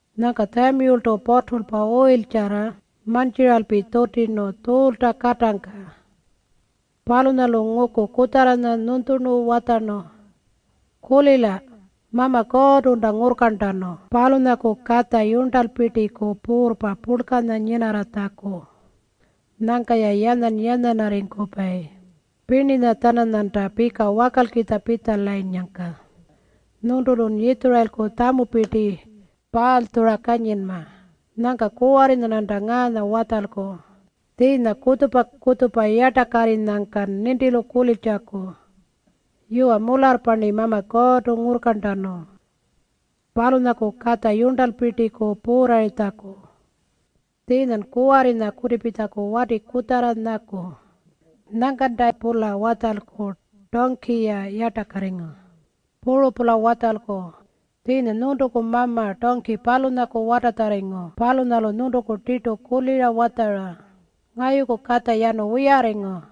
Nyangka Tjamiyultu puturlpa uyiltjarra mantjiralpi tjutirnu Tjuulta katangka. Palunyalu nguku kutjarranya nyunytjurnu watjarnu, “Kulila, Mama Kuurrtunta ngurrkarntanu palunyaku katja yurntalpirtiku puurrpa purlkanya nyinarratjaku. Nyangka-ya yanyan-yanyanarripayi pirninya-tjananyanta pika wakalkitja pitjalanyangka nyuntulun Yitjurayilku tjamupirti paalytjura kanyinma. Nyangka kuwarrinya-rnanta ngaanya watjalku tjiinya kutjupa-kutjupa yartakarrinyangkan nintilu kuliltjaku, ‘Yuwa mularrpa-rni Mama Kuurrtu ngurrkarntanu palunyaku katja yurntalpirtiku puurrarritjaku.’ Tjiinyan kuwarrinya kutipitjaku wati kutjarra nyaku. Nyangkanta-pula watjalku tungki-ya yartakarringu. Puru-pula watjalku tjiinya nyuntuku mama tungki palunyaku watatjarringu palunyalu nyuntuku tirtu kulira watjara, ‘Ngayuku katja yanu wiyarringu.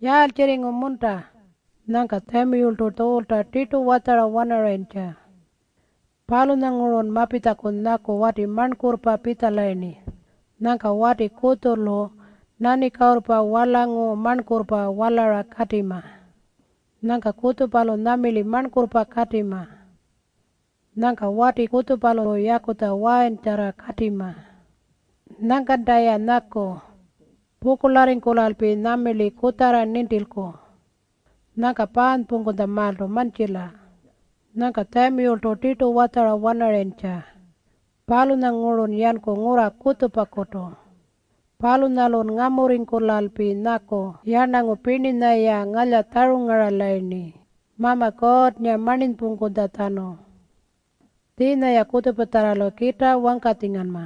Yaaltjirringu-munta?’” Nyangka Tjamiyultu Tjuulta tirtu watjara-wanarayintja, “Palunyangurun mapitjaku nyaku wati marnkurrpa pitjalayirni. Nyangka wati kutjulu nanikuurrpa warlangu marnkurrpa walara katima. Nyangka kutjupalu nyamirli marnkurrpa katima. Nyangka wati kutjupalu yakutja wayintjarra katima. Nyangkanta-ya nyaku pukurlarringkulalpi nyamirli kutjarra nintilku. Nyangka paanypungkutjamaaltu mantjila.” Nyangka Tjamiyultu tirtu watjara-wanarayintja, “Palunyangurun yanku ngurra kutjupakutu. Palunyalun ngamurringkulalpi nyaku yarnangu pirninya-ya ngalyatjarungaralayirni Mama Kuurrnga marninypungkutjatjanu. Tjiinya-ya kutjupatjarralu kitaa wangkatjinganma.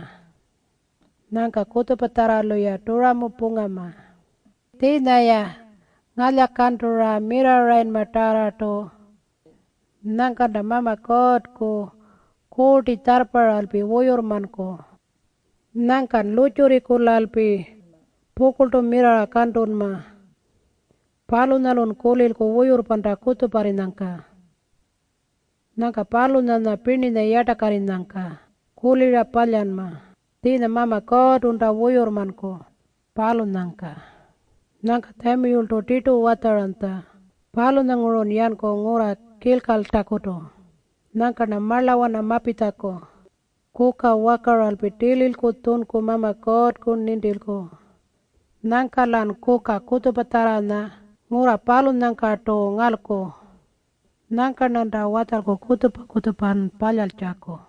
Nyangka kutjupatjarralu-ya turamu pungama. Tjiinya-ya ngalyakantura mirrarrayinmatarrartu. Nyangkanta Mama Kuurrku Kuurti tjarrparralpi wuyurrmanku. Nyangkan lurrtjurringkulalpi pukurltu mirrarra kantunma. Palunyalun kulilku wuyurrpanta kutjuparrinyangka. Nyangka palunyanya pirninya yartakarrinyangka kulira palyanma tjiinya Mama Kuurrtunta wuyurrmanku, palunyangka.” Nyangka Tjamiyultu tirtu watjaranytja, “Palunyangurun yanku ngurra Kilkaltakutu. Nyangka-rna marlawana mapitjaku kuka wakaralpi tililku tjunku Mama Kuurrku nintilku. Nyangka-lan kuka kutjupatjarranya ngurra palunyangkartu ngalku. Nyangka-rnanta watjalku kutjupa-kutjupa palyaltjaku.”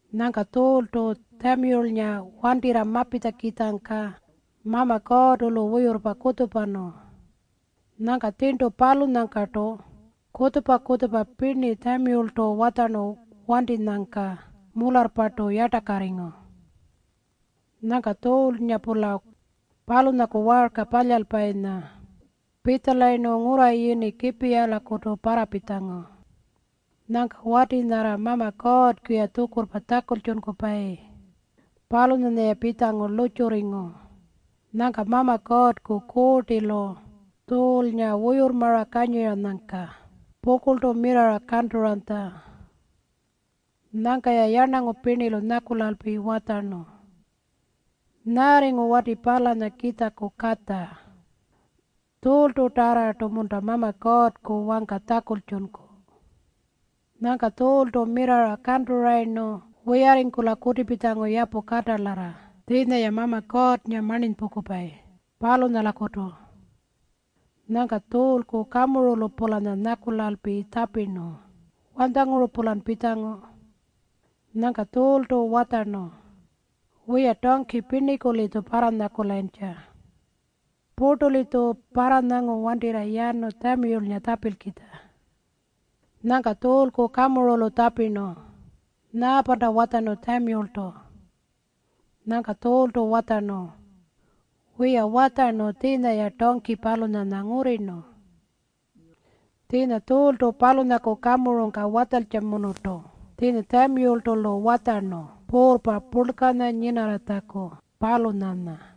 Nyangka Tjuultu Tjamiyulnga wantirra mapitjakitjangka Mama Kuurrtu-lu wuyurrpa kutjupanu. Nyangka tjirntu palunyangkartu kutjupa-kutjupa pirni Tjamiyultu watjarnu wantinyangka mularrpartu yartakarringu. Nyangka Tjuulnga-pula palunyaku waarka palyalpayinya pitjalayirnu ngurra yini Kipiyaku parrapitjangu. Nyangka-ya wati nyarra Mama Kuurrku wangka kulira tjakultjunkupayi, palunyanya-ya pitjangu lurrtjurringu. Nyangka Mama Kuurrku Kuurtilu Tjuulnga wuyurrmara kanyiranyangka pukurltu mirrarra kanturanytja. Nyangka-ya yarnangu pirnilu nyakulalpi watjarnu, “Nyaarringu wati palanya Kiitjaku katja? Tjuultutarrartu-munta Mama Kuurrku wangka tjakultjunku?” Nyangka Tjuultu mirrarra kanturayirnu wiyarringkula kutipitjangu yapu katalarra tjiinya-ya Mama Kuurrnga marninypungkupayi, palunyalakutu. Nyangka Tjuulku kamurulu-pulanya nyakulalpi tjapirnu, “Wanytjanguru-pulan pitjangu?” Nyangka Tjuultu watjarnu, “Wiya, tungki pirniku-litju parranyakulayintja. Purtu-litju parranyangu wantirra yanu Tjamiyulnga tjapilkitja.” Nyangka Tjuulku kamurulu tjapirnu, “Nyaapanta watjarnu Tjamiyultu?” Nyangka Tjuultu watjarnu, “Wiya, watjarnu tjiinya-ya tungki palunyanya ngurrirnu.” Tjiinya Tjuultu palunyaku kamurungka watjantjamunurtu tjiinya Tjamiyultu-lu watjarnu puurrpa purlkanya nyinarratjaku, palunyanya.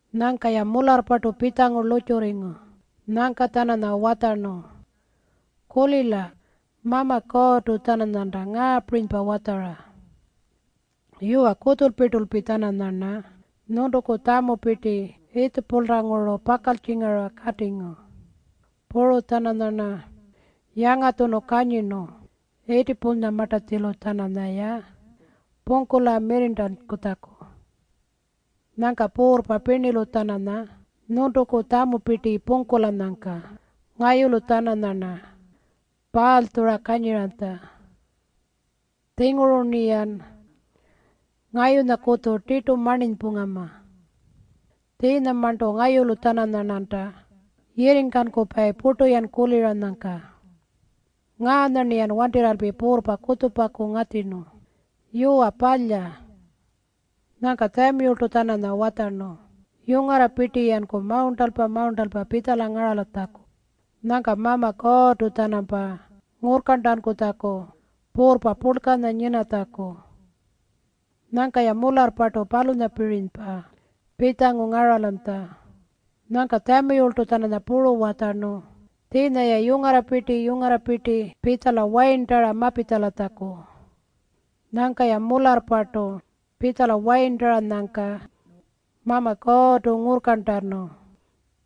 Nyangka-ya mularrpartu pitjangu lurrtjurringu. Nyangka-tjananya watjarnu, “Kulila, Mama Kuurrtu-tjananyanta ngaapirinypa watjara, ‘Yuwa, kutjulpirtulpi-tjananyarna nyuntuku tjamupirti Yiitjipulanguru pakaltjingara katingu. Puru-tjananyarna yangatjunu kanyirnu Yiitjipunyamartatjilu-tjananyaya pungkula mirrirntankutjaku. Nyangka puurrpa pirnilu-tjananya nyuntuku tjamupirti pungkulanyangka ngayulu-tjananyarna paalytjura kanyiranytja. Tjinguru-rniyan ngayunyakutju tirtu marninypungama. Tjiinyamarntu ngayulu-tjananyarnanta yirringkankupayi purtu-yan kuliranyangka. Ngaanya-rniyan wantirralpi puurrpa kutjupaku ngatjirnu. Yuwa, palya.’” Nyangka Tjamiyultu-tjananya watjarnu yungarrapirti-yanku mawurntalpa-mawurntalpa pitjala ngaratjaku nyangka Mama Kuurrtu-tjanampa ngurrkarntankutjaku puurrpa purlkanya nyinatjaku. Nyangka-ya mularrpartu palunyapirinypa pitjangu ngaralanytja. Nyangka Tjamiyultu-tjananya puru watjarnu tjiinya-ya yungarrapirti-yungarrapirti pitjala wayirntara mapitjalatjaku. Nyangka-ya mularrpartu pitjala wayirntaranyangka Mama Kuurrtu ngurrkarntanu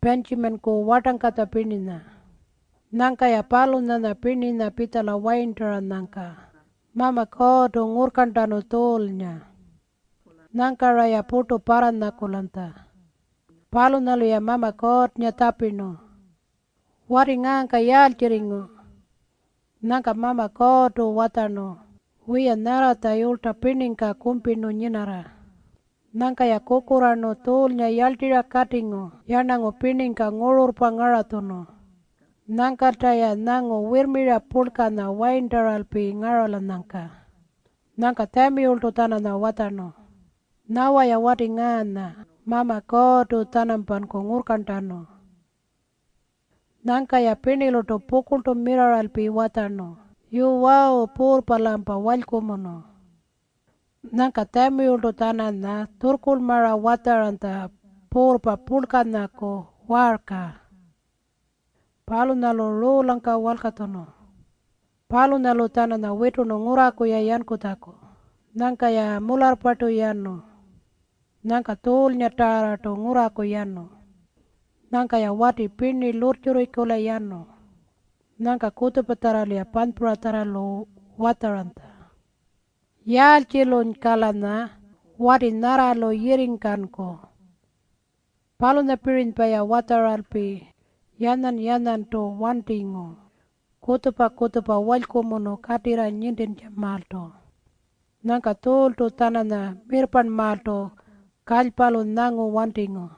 Pintjimanku wartangkatja pirninya. Nyangka-ya palunyanya pirninya pitjala wayirntaranyangka Mama Kuurrtu ngurrkarntanu Tjuulnga. Nyangka-raya purtu parranyakulanytja. Palunyalu-ya Mama Kuurrnga tjapirnu, “Wati ngaangka yaaltjirringu?” Nyangka Mama Kuurrtu watjarnu, “Wiya, nyarratja yulytja pirningka kumpirnu nyinarra.” Nyangka-ya kukurraarnu Tjuulnga yarltirra katingu yarnangu pirningka ngururrpa ngaratjunu. Nyangkalta-ya nyangu wirrmira purlkanya wayirntalpa ngaralanyangka. Nyangka Tjamiyultu-tjananya watjarnu, “Nyawa-ya wati ngaanya Mama Kuurrtu-tjanampanku ngurrkarntanu.” Nyangka-ya pirnilurtu pukurltu mirrarralpi watjarnu, “Yuwawu! Puurrpa-lampa walykumunu!” Nyangka Tjamiyultu-tjananya tjurrkurlmara watjaranytja puurrpa purlkanyaku waarka. Palunyalu ruulangka walkatjunu. Palunyalu-tjananya witurnu ngurraku-ya yankutjaku. Nyangka-ya mularrpartu yanu. Nyangka Tjuulngatarrartu ngurraku yanu. Nyangka-ya wati pirni lurrtjurringkula yanu. Nyangka kutjupatjarralu-ya panypuratjarralu watjaranytja, “Yaaltjilunyka-lanya wati nyarralu yirringkanku?” Palunyapirinypa-ya watjaralpi yanyan-yanyantu wantingu kutjupa-kutjupa walykumunu katirra nintintjamaaltu. Nyangka Tjuultu-tjananya mirrparnmaaltu kalypalu nyangu wantingu.